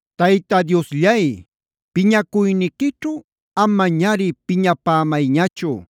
Tayta Diosllay, piñacuyniquićhu amañari piñapämayñachu,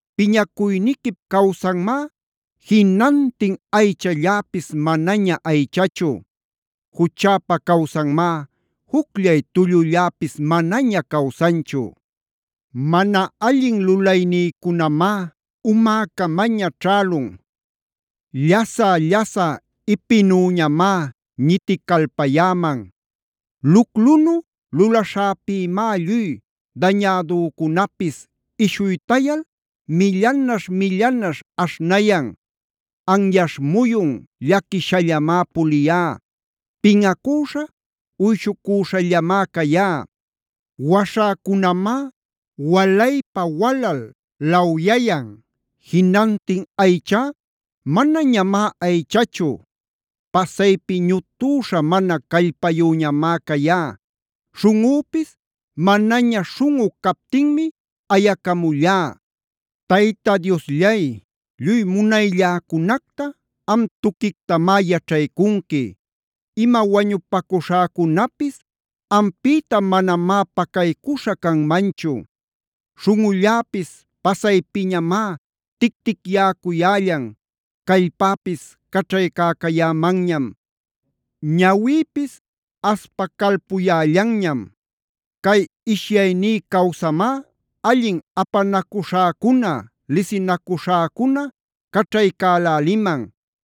Piñacuyniquip-cawsanmá jinantin aychalläpis manaña aychachu. Juchäpa-cawsanmá jucllay tullulläpis manaña cawsanchu. Mana allin lulaynïcunamá umäcamaña ćhälun. Llasä-llasä ipinüñamá ñiticalpayäman. Luclunu lulaśhäpïmá lluy dañädücunapis ishuytayal millanaśh-millanaśh aśhnayan. Anyaśh muyun llaquishallamá puliyá. Pinꞌacüśha, uyshucuśhallamá cayá. Waśhäcunamá walaypa-walal lawyayan. Jinantin aychá manañamá aychachu. Pasaypi ñutüśha mana callpayüñamá cayá. Śhunꞌüpis manaña śhunꞌu captinmi ayacamullá. Tayta Diosllay, lluy munaylläcunacta am tuquictamá yaćhaycunqui. Ima wañupacuśhäcunapis ampïta manamá pacaycuśha canmanchu. Śhunꞌulläpis pasaypiñamá ticticyäcuyällan. Callpäpis caćhaycäcayämanñam; ñawïpis aspacalpuyällanñam. Cay ishyaynï-cawsamá allin apanacuśhäcuna,c lisinacuśhäcuna caćhaycäläliman.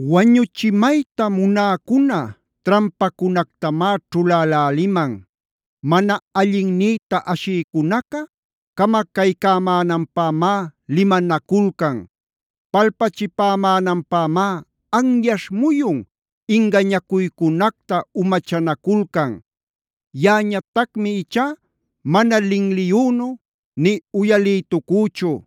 Wañuchimayta munäcuna trampacunactamá ćhuläläliman. Mana allinnïta ashïcunaca camacaycämänanpämá limanaculcan; palpachipämänanpämá anyaśh muyun ingañacuycunacta umachanaculcan. Yaꞌañatacmi ichá mana linliyünu nï uyalïtucüchu.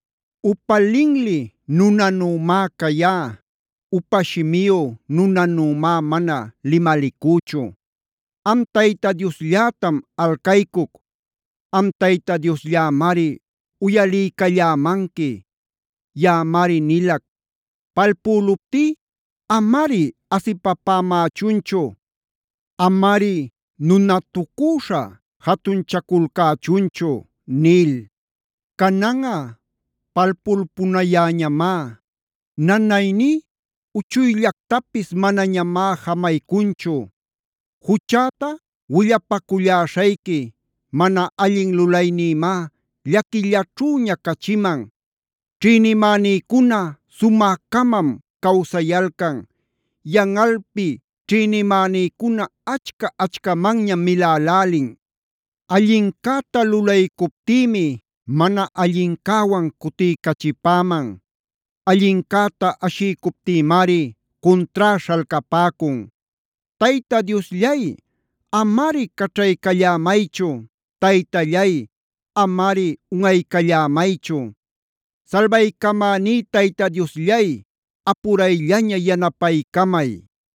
Upa linli nunanümá cayá; upa shimiyu nunanümá mana limalicüchu. Am Tayta Diosllätam alcaycuc. Am Tayta Diosllämari uyaliycallämanqui. Yaꞌamari nilac: “Palpüluptí amari asipapämächunchu; amari nunatucüśha jatunchaculcächunchu” nil. Cananꞌa palpulpunayäñamá. Nanayní uchuyllactapis manañamá jamaycunchu. Juchäta willapaculläśhayqui. Mana allin lulaynïmá llaquillaćhüña cachiman. Ćhïnimänïcuna sumä-camam cawsayalcan. Yanꞌalpi ćhïnimänïcuna achca-achcamanñam milälälin. Allincäta lulaycuptïmi mana allincäwan cutiycachipäman. Allincäta ashiycuptïmari cuntrá śhalcapäcun. Tayta Diosllay, amari caćhaycallämaychu. Taytallay, amari unꞌaycallämaychu. Salbaycamäní Tayta Diosllay, ¡apurayllaña yanapaycamay!